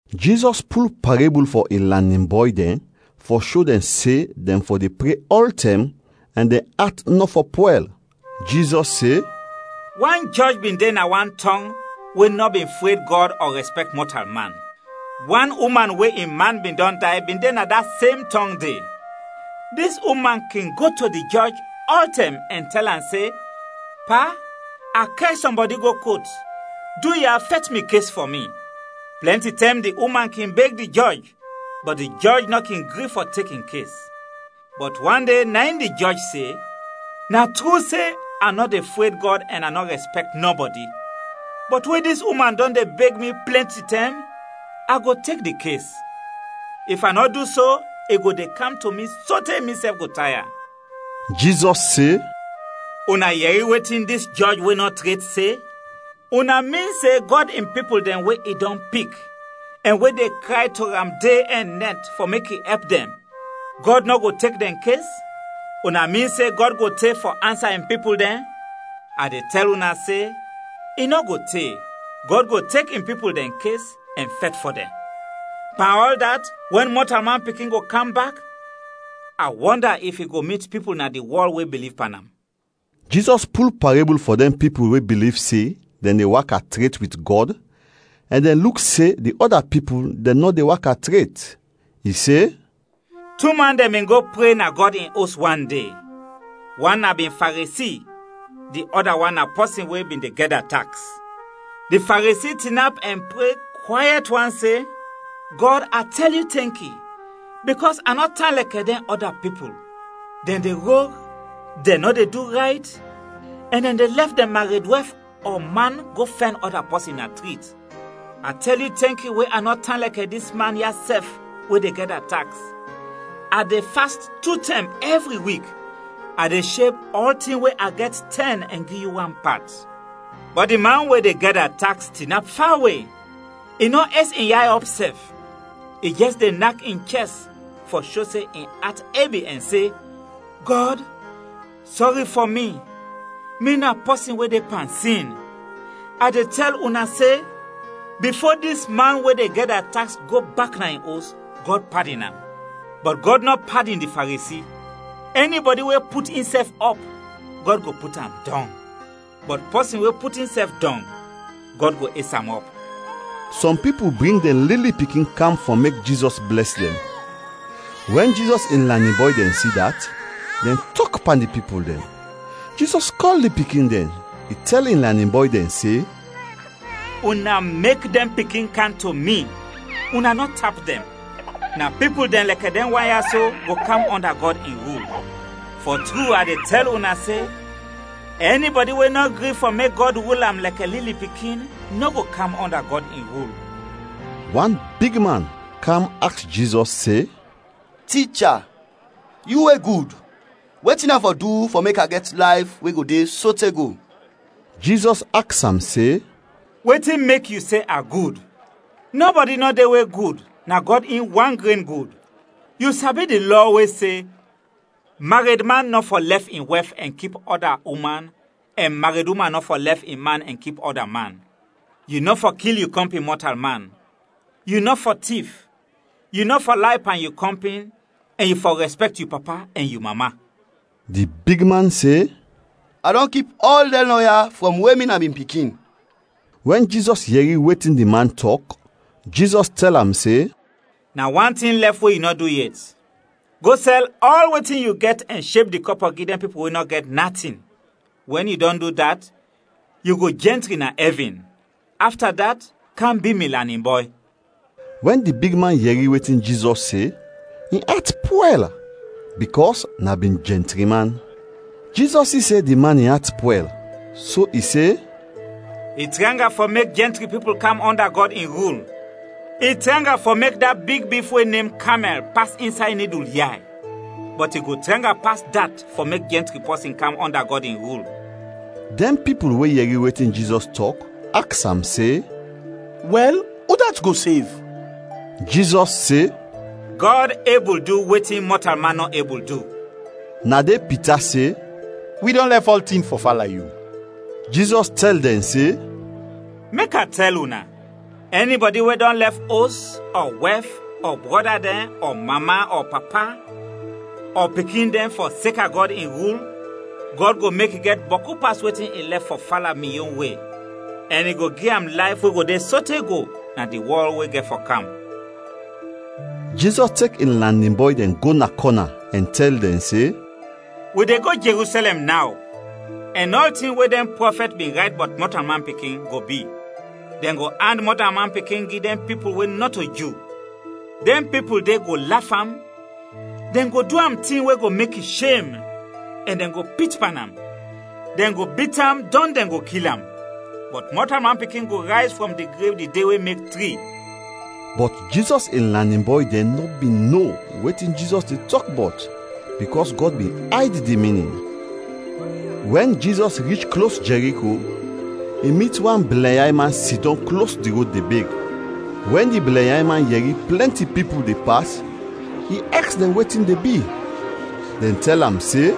Jizɔs pul parebul fɔ in lanin bɔy dɛn fɔ sho dɛn se dɛn fɔ de pre ɔltɛm ɛn dɛn at nɔ fɔ pwɛl. Jizɔs se: “Wan jɔj bin de na wan tɔng we nɔ bin fred Gɔd ɔ rɛspɛkt mɔtalman. Wan uman we in man bin dɔn day bin de na da sem tɔng de. Dis uman kin go to di jɔj ɔltɛm ɛn tɛl am se, ‘Pa, a kɛr sɔmbɔdi go kot, duya, fɛt mi kes fɔ mi.’ Plɛnti tɛm di uman kin beg di jɔj, bɔt di jɔj nɔ kin gri fɔ tek in kes. Bɔt wan de, na in di jɔj se, ‘Na tru se, a nɔ de fred Gɔd ɛn a nɔ rɛspɛkt nɔbɔdi, bɔt we dis uman dɔn de beg mi plɛnti tɛm, a go tek di kes. If a nɔ du so, i go de kam to mi sote misɛf go taya!’” Jizɔs se, “Una yɛri wetin dis jɔj we nɔ tret se? Una min se Gɔd in pipul dɛn we i dɔn pik ɛn we de kray to am de ɛn nɛt fɔ mek i ɛp dɛn, Gɔd nɔ go tek dɛn kes? Una min se Gɔd go te fɔ ansa in pipul dɛn? A de tɛl una se, i nɔ go te, Gɔd go tek in pipul dɛn kes ɛn fɛt fɔ dɛn! Pan ɔl dat, wɛn Mɔtalman Pikin go kam bak, a wɔnda if i go mit pipul na di wɔl we biliv pan am!” Jizɔs pul parebul fɔ dɛn pipul we biliv se dɛn de waka tret wit Gɔd ɛn dɛn luk se di ɔda pipul dɛn nɔ de waka tret. I se: “Tu man dɛn bin go pre na Gɔd in Os wan de; wan na bin Faresi, di ɔda wan na pɔsin we bin de gɛda taks. “Di Faresi tinap ɛn pre kwayɛt wan se, ‘Gɔd, a tɛl yu tɛnki bikɔs a nɔ tan lɛkɛ dɛn ɔda pipul; dɛn de rog, dɛn nɔ de du rayt, ɛn dɛn de lɛf dɛn mared wɛf ɔ man go fɛn ɔda pɔsin na trit. A tɛl yu tɛnki we a nɔ tan lɛkɛ dis man ya sɛf we de gɛda taks. A de fast tu tɛm ɛvri wik, a de sheb ɔltin we a gɛt tɛn ɛn gi yu wan pat.’ “Bɔt di man we de gɛda taks tinap fawe, i nɔ es in yay ɔp sɛf. I jɛs de nak in chɛst fɔ sho se in at ebi ɛn se, ‘Gɔd, sɔri fɔ mi, mi na pɔsin we de pan sin!’ A de tɛl una se, bifo dis man we de gɛda taks go bak na in os, Gɔd padin am; bɔt Gɔd nɔ padin di Faresi. Ɛnibɔdi we put insɛf ɔp, Gɔd go put am dɔng, bɔt pɔsin we put insɛf dɔng, Gɔd go es am ɔp.” Sɔm pipul bring dɛn lili pikin kam fɔ mek Jizɔs blɛs dɛn. Wɛn Jizɔs in lanin bɔy dɛn si dat, dɛn tɔk pan di pipul dɛn. Jizɔs kɔl di pikin dɛn, i tɛl in lanin bɔy dɛn se, “Una mek dɛn pikin kam to mi, una nɔ tap dɛn; na pipul dɛn lɛkɛ dɛn wan ya so go kam ɔnda Gɔd in rul. Fɔ tru, a de tɛl una se, ɛnibɔdi we nɔ gri fɔ mek Gɔd rul am lɛkɛ lili pikin, nɔ go kam ɔnda Gɔd in rul.” Wan bigman kam aks Jizɔs se, “Ticha, yu we gud, wetin a fɔ du fɔ mek a gɛt layf we go de sote go?” Jizɔs aks am se, “Wetin mek yu se a gud? Nɔbɔdi nɔ de we gud, na Gɔd in wan gren gud. Yu sabi di Lɔ we se, ‘maredman nɔ fɔ lɛf in wɛf ɛn kip ɔda uman ɛn mareduman nɔ fɔ lɛf in man ɛn kip ɔda man, yu nɔ fɔ kil yu kɔmpin mɔtalman, yu nɔ fɔ tif, yu nɔ fɔ lay pan yu kɔmpin ɛn yu fɔ rɛspɛkt yu papa ɛn yu mama.’” Di bigman se, “A dɔn kip ɔl dɛn lɔ ya frɔm we mi na bin pikin.” Wɛn Jizɔs yɛri wetin di man tɔk, Jizɔs tɛl am se, “Na wan tin lɛf we yu nɔ du yet. Go, sɛl ɔl wetin yu gɛt ɛn sheb di kɔpɔ gi dɛn pipul we nɔ gɛt natin. Wɛn yu dɔn du dat, yu go jɛntri na ɛvin. Afta dat kam bi mi lanin bɔy.” Wɛn di bigman yɛri wetin Jizɔs se, in at pwɛl bikɔs na bin jɛntri man. Jizɔs si se di man in at pwɛl, so i se, “I tranga fɔ mek jɛntri pipul kam ɔnda Gɔd in rul. I tranga fɔ mek da big bif we nem kamɛl pas insay nidul yay, bɔt i go tranga pas dat fɔ mek jɛntri pɔsin kam ɔnda Gɔd in rul.” Dɛn pipul we yɛri wetin Jizɔs tɔk, aks am se, “Wɛl, udat go sev?” Jizɔs se, “Gɔd ebul du wetin mɔtalman nɔ ebul du.” Na de Pita se, “Wi dɔn lɛf ɔltin fɔ fala yu.” Jizɔs tɛl dɛn se, “Mek a tɛl una, ɛnibɔdi we dɔn lɛf os, ɔ wɛf, ɔ brɔda dɛn, ɔ mama, ɔ papa, ɔ pikin dɛn fɔseka Gɔd in rul, Gɔd go mek i gɛt bɔku pas wetin i lɛf fɔ fala mi yon we, ɛn i go gi am layf we go de sote go na di wɔl we gɛt fɔ kam.” Jizɔs tek in lanin bɔy dɛn go na kɔna ɛn tɛl dɛn se, “Wi de go Jerusɛlɛm naw ɛn ɔltin we dɛn prɔfɛt bin rayt bɔt Mɔtalman Pikin go bi. Dɛn go and Mɔtalman Pikin gi dɛn pipul we nɔto Ju. Dɛn pipul de go laf am, dɛn go du am tin we go mek i shem, ɛn dɛn go pit pan am. Dɛn go bit am, dɔn dɛn go kil am, bɔt Mɔtalman Pikin go rayz frɔm di grev di de we mek tri.” Bɔt Jizɔs in lanin bɔy dɛn nɔ bin no wetin Jizɔs de tɔk bɔt bikɔs Gɔd bin ayd di minin. Wɛn Jizɔs rich klos Jɛriko, i mit wan blɛnyay man sidɔm klos di rod de beg. Wɛn di blɛnyay man yɛri plɛnti pipul de pas, i aks dɛn wetin de bi. Dɛn tɛl am se,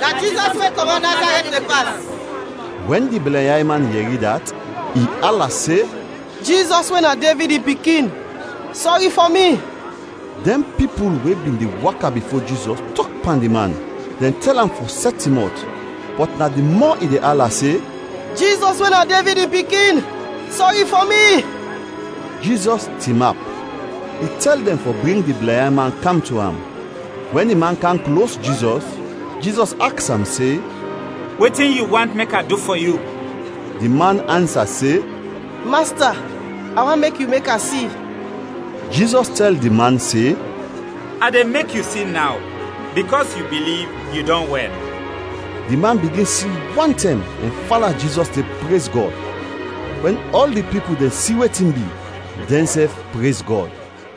“Na Jizɔs we kɔmɔt Nazarɛt de pas.” Wɛn di blɛnyay man yɛri dat, i ala se, “Jizɔs we na Devid in pikin, sɔri fɔ mi!” Dɛn pipul we bin de waka bifo Jizɔs tɔk pan di man, dɛn tɛl am fɔ sɛt in mɔt, bɔt na di mɔ i de ala se, “Jizɔs we na Devid in pikin, sɔri fɔ mi!” Jizɔs tinap. I tɛl dɛn fɔ bring di blɛnyay man kam to am; wɛn di man kam klos Jizɔs, Jizɔs aks am se, “Wetin yu want mek a du fɔ yu?” Di man ansa se, “Masta, a want mek yu mek a si.” Jizɔs tɛl di man se, “A de mek yu si naw, bikɔs yu biliv, yu dɔn wɛl!” Di man bigin si wantɛm ɛn fala Jizɔs de prez Gɔd. Wɛn ɔl di pipul dɛn si wetin bi, dɛnsɛf prez Gɔd.